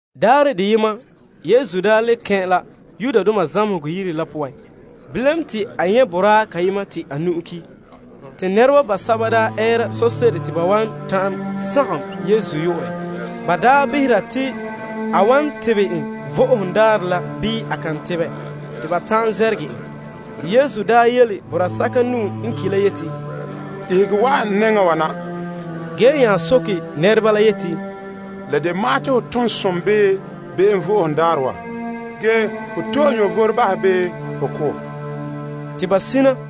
Daarɛ deyema Yesu daa kɛn' la zamehegɔ yire la poan. Ge te a nyɛ' boraa kayema te a nu'o daa ki'. Bilam te nɛreba basɛba daa ɛɛra sose'ere te ba wan ta'an sagom Yesu yu'urɛ te ba behera te a wan tebɛ en Vo'ohogo Daarɛ la bii a kan tebɛ, te ba ta'an zɛrɛgɛ en. Yesu yele boraa sɛka nu'o n ki' la yeti, Ihege wa'an n nɛŋa wa na. A nya soke nɛreba la yeti, La de ma'an te ho tom som bii be'em Vo'ohogo Daarɛ wa, ge ho to'e vom bahɛ, bii ho ko'? Te ba sina.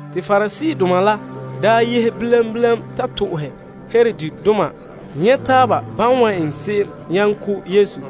Pariseedoma la nya yehe bilam bilam ta to'ohɛ Herodidoma nyɛ' taaba ban wan eŋɛ se'em nyaŋɛ ko' Yesu.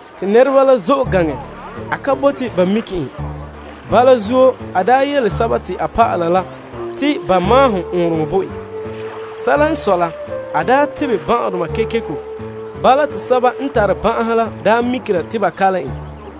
Te nɛreba la zo'e gaŋɛ mɛ ge a ka bote ba mike en. Bala zuo, a daa yele a dɔlɔba la te ba maahom ɔɔnrɔŋɔ bo en. Se'ere n sɔe la, a daa tebɛ ban'ahedoma kekeko. Bala te sɛba n tare ban'ahe la mikera te ba kalom en.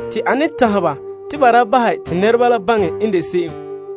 Ge a tanhɛ ba te ba da bahɛ te nɛreba la baŋɛ n de se'em.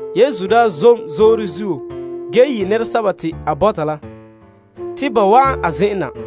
Yesu daa zom zoore zuo ge yi' nɛresɛba te a bɔta la, te ba wa'an a zen'en na.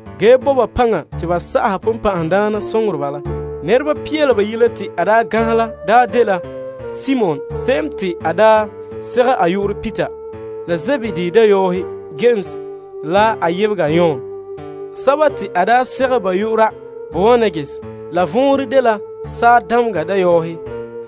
ge bo ba paŋa te ba sa'aha bonbɛ'ɛhe la. Nɛreba pia la bayi' la te a daa ganhɛ la daa dela Simon se'em te a daa segɛ a yu'urɛ Peter la Zebedee dayɔɔhe Yames la a yebega Yon sɛba te a daa segɛ ba yu'ura te Boanerges, vɔnrɛ la n de Saadameŋa Dayɔɔhe,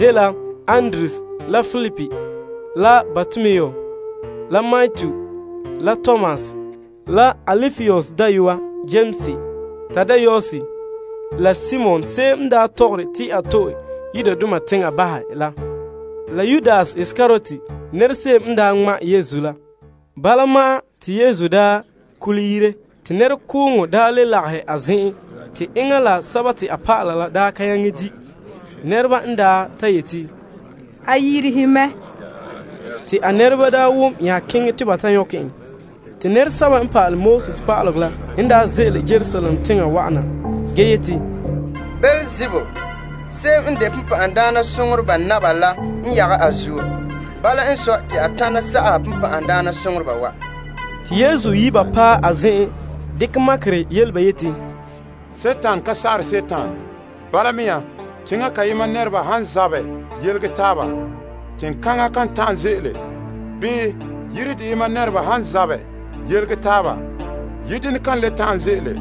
la Andrew la Filip la Bartolomu la Matu la Tomas la Alpaeus dayɔa Yames la Tadaeus la Simon se'em n daa tɔgɔre te a to'e Yudoma teŋa bahɛ la Yudas Iskariot se'em n daa ŋma' Yesu la. Te Yesu daa nya kɛn' yire, te nɛrekooŋɔ le lagahɛ a zen'en te enŋa la a dɔlɔba la ka nyaŋɛ di'. Nɛreba n ta yeti, A yirihe mɛ. A nɛreba n wom bala nya keŋɛ te ba ta nyɔkɛ en. Pa'alegɔ pa'aleba basɛba n ze'ele Yerusalem teŋa wa'ana la yeti, Beelzebul, bonbɛ'ɛhe naba la n yagɛ a zuo. Bala n sɔe, te a tana sa'aha bonbɛ'ɛhe wa. Te Yesu yi' ba paɛ a zen'en dekɛ makerɛ yele ba yeti, Dima ka sa'ahe Dima. Bala mea, teŋa kayema nɛreba han zabɛ yelege taaba, teŋkaŋa kan ta'an ze'ele. Bii, yire deyema nɛreba han zabɛ yelege taaba, yire denɛ kan le ta'an ze'ele.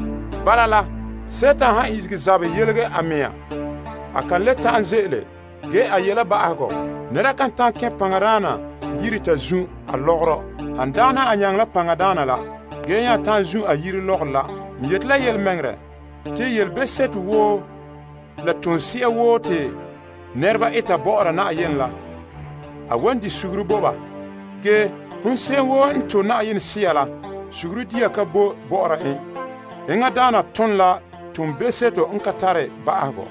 Bala la, Dima han ihege zabɛ yelege a mɛŋa, a kan le ta'an ze'ele, ge a yi' la ba'ahegɔ. Nɛra kan ta'an kɛn' paŋadaana yire ta zun' a lɔgɔrɔ han dagɛna a nyaŋɛ la paŋadaana la ge nya ta'an zun' a yire lɔgɔrɔ la. N yeti ya la yelemɛŋɛrɛ, te yelebe'seto woo la tose'a woo te nɛreba eta bɔ'ɔra Yenɛ la, a wan bahɛ bo ba. Ge, hon se'em woo n to' Yenɛ Sea la, be'em bahega ka boe bɔ'ɔra en. Enŋadaana ton la toonbe'seto n ka tare ba'ahegɔ.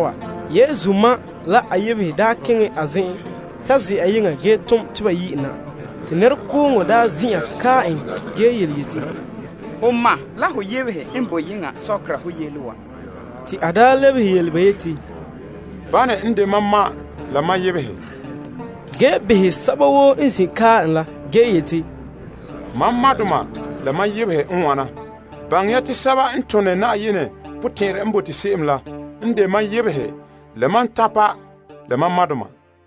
Yesu ma la a yebehe la daa nya paɛ a zen'en ta ze'a yeŋa ge tom te ba ta yi' en na. Nɛrekooŋɔ zin'an kae en ge yele en yeti, Ho ma la ho yebehe n boe yeŋa sɔkera ho yele wa. Te a lebehe ba yeti, Bane n de mam ma la mam yebehe? Te a nya behɛ sɛba woo n zin' kae en la ge yeti, Mam madoma la mam yebehe n wana. Baŋɛ ya te sɛba n tone Yenɛ potɛn'ɛrɛ n bote se'em la n de mam yebehe la mam tanpa la mam madoma.